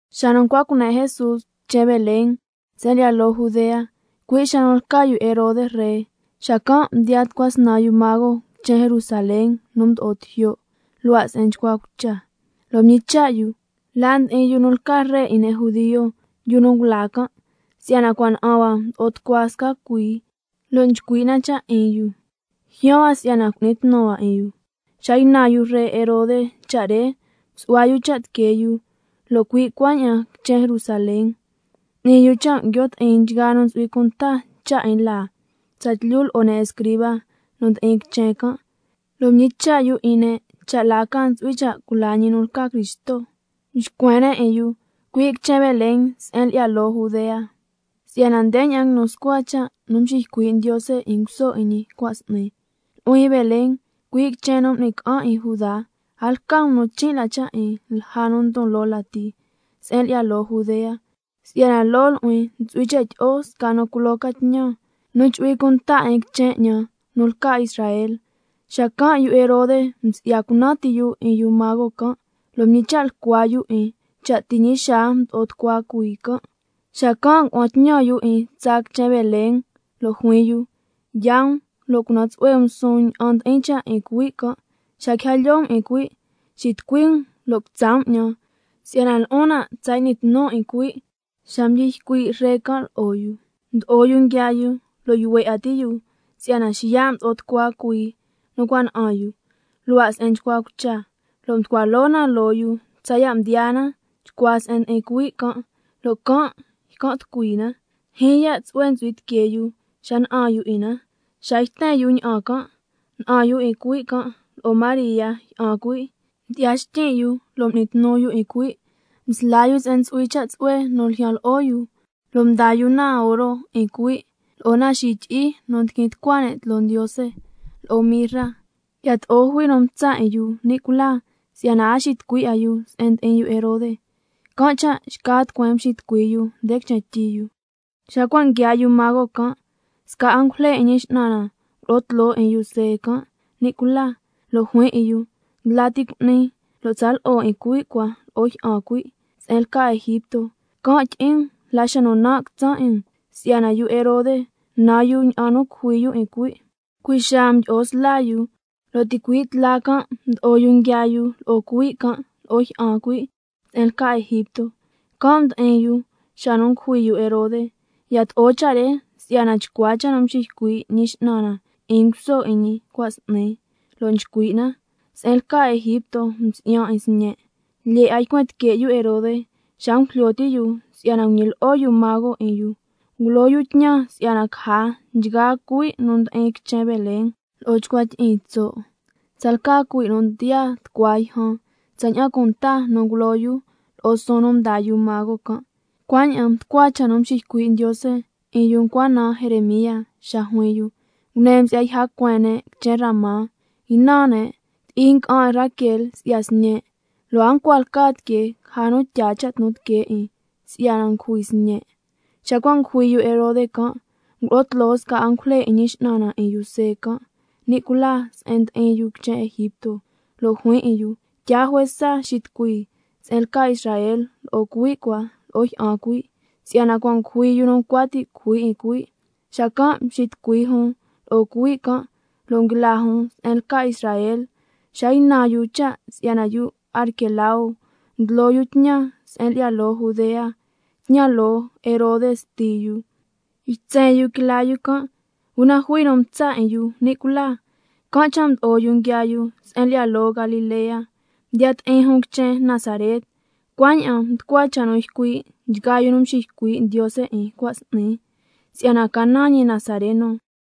Xa nu ncua cune' Jesús quichen Belén se'en lyi'ya loo Judea, cui' xa nu lca yu Herode ree, xacan' mdiyaa tucua snan yu mago quichen Jerusalén nu mdo'o tijyo', luhua' se'en nchcua cucha, lo' mñicha' yu: ¿La ndi'in yu nu lca ree 'in ne' judio, yu nu ngula can'? Si'yana cua' na'an hua mdo'o tucua sca cuii, lo' nchcui' na cha' 'in yu, ljyaan hua si'yana cu'ni tnu hua 'in yu. Xa ynan yu ree Herode cha' re, msu'hua yu cha' tiquee yu, lo' cui' cuaña'an quichen Jerusalén. M'ni yu cha' nguio' ti'in nchgaa nu ntsu'hui cunta cha' 'in laa, tsatlyu lo'o ne' escriba nu ndi'in quichen can', lo' mñicha' yu 'in ne' cha' la ca ntsu'hui cha' cula ñi nu lca Cristo. Mxcuen ne' 'in yu: Cui' quichen Belén se'en lyi'ya loo Judea, si'yana ndeña'an nguinu scua cha' nu mxiycui' Ndiose 'in nguso 'in ñi cua' s'ni: —Nu'huin Belén, cui' quichen nu m'ni ca'an 'in Judá, a lca um nu chin' la cha' 'in lja nu ndon loo lati se'en lyi'ya loo Judea, si'yana loo nu'huin ntsu'hui cha' tyi'o sca nu culo ca tñan, nu chu'hui cunta 'in quichen 'ñan nu lca Israel—. Xacan' yu Herode msi'ya cunan ti yu 'in yu mago can', lo' mñicha' lyicua yu 'in, cha' ti' ñi xaa mdo'o tucua cuii can', xacan' ngua'an tñan yu 'in tsaa quichen Belén, lo' juin yu: Yaa um, lo' cunan tsu'hue um suun ña'an ndi'in cha' 'in cuhui' can', xa quija lyoo um 'in cuhui', xitucui um lo' quitsa' um 'ñan, si'yana lo'on nan' tsa y'nin tnun 'in cuhui'. Xa mdyi ycui' ree can' lo'o yu, mdo'o yu nguiaa yu, lo' yuhue 'a ti' yu si'yana xiya' mdo'o tucua cuii nu cua' na'an yu, luhua' se'en nchcua cucha, lo' mducua loo na loo yu tsaya' mdiyaa na chcua se'en ndi'in cuhui' can', lo' can' ycan' tucui na. Ndyijyin ya' tsu'hue ntsu'hui tiquee yu xa na'an yu 'in na. Xa yten yu ña'an can', na'an yu 'in cuhui' can' lo'o María jyi'an cuhui', mdyi'ya xtyin' yu lo' m'ni tnu yu 'in cuhui', msla yu se'en ntsu'hui cha' tsu'hue nu ljyan lo'o yu, lo' mdaa yu na oro 'in cuhui', lo'o na xityi'i nu ndiquin tucua ne' tloo Ndiose, lo'o mirra. Yato'o jui nu mtsa' 'in yu ni' cula, si'yana a xitucui 'a yu se'en ndi'in yu Herode, can' cha' xca tucueen mxitucui yu nde quichen tyi yu. Xa cua' nguiaa yu mago can', sca angujle 'in Ñi X'nan na ngulo'o tloo 'in yu See can' ni' cula, lo' juin 'in yu: Ndla ti cu'ni, lo' tsa lo'o 'in cuhui' cua lo'o jyi'an cuhui' se'en lca Egipto, can' tyi'in um la xa nu nan' quitsan' 'in, si'yana yu Herode nan yu ña'an nu cujui yu 'in cuhui'. Cui' xaa mdyi'o sla yu, lo' ticui' tla can' mdo'o yu nguiaa yu lo'o cuhui' can' lo'o jyi'an cuhui' se'en lca Egipto. Can' ndi'in yu xa ngujui yu Herode, yato'o cha' re si'yana chcua cha' nu mxiycui' Ñi X'nan na 'in nguso 'in ñi cua' s'ni, lo' nchcui' na: —Se'en lca Egipto msi'yan 'in Sñen'—. Lo' yato'o lyee 'a ycuen tique' yu Herode, xa ngujlyo ti' yu si'yana nguñilyi'o yu mago 'in yu, ngulo yu tñan si'yana caja nchgaa cuhui' nu ndi'in quichen Belén lo'o chcua tyi'iin tso', tsalca cuhui' nu ndiyaa tucua yjan, tsaña'an cunta nu ngulo yu lo'o suun nu mdaa yu mago can'. Cuaña'an mducua cha' nu mxiycui' Ndiose 'in yu ncua naan Jeremía xa juin yu: —Ngune msi'ya yja cueen ne' quichen Ramá, nguinan ne', ti'i nga'an 'in Raquel si'ya sñe', lo' a ncua lca tiquee caja nu tyaa cha' tnu tiquee 'in si'yana ngujui sñe'—. Xa cua' ngujui yu Herode can', ngulo'o tloo sca angujle 'in Ñi X'nan na 'in yu See can' ni' cula, se'en ndi'in yu quichen Egipto, lo' juin 'in yu: Tyaa juesa xitucui se'en lca Israel lo'o cuhui' cua lo'o jyi'an cuhui', si'yana cua' ngujui yu nu ncua ti' cujui 'in cuhui'. Xacan' mxitucui jun lo'o cuhui' can', lo' nguila jun se'en lca Israel. Xa ynan yu cha' si'yana yu Arquelao ndlo yu tñan se'en lyi'ya loo Judea, tñan loo Herode sti yu, ytsen yu quila yu can', una jui nu mtsa' 'in yu ni' cula, can' cha' mdo'o yu nguiaa yu se'en lyi'ya loo Galilea. Mdiya ti'in jun quichen Nazaret, cuaña'an mducua cha' nu ycui' nchgaa yu nu mxiycui' Ndiose 'in cua' s'ni, ña'an ca si'yana ca naan ñi Nazareno.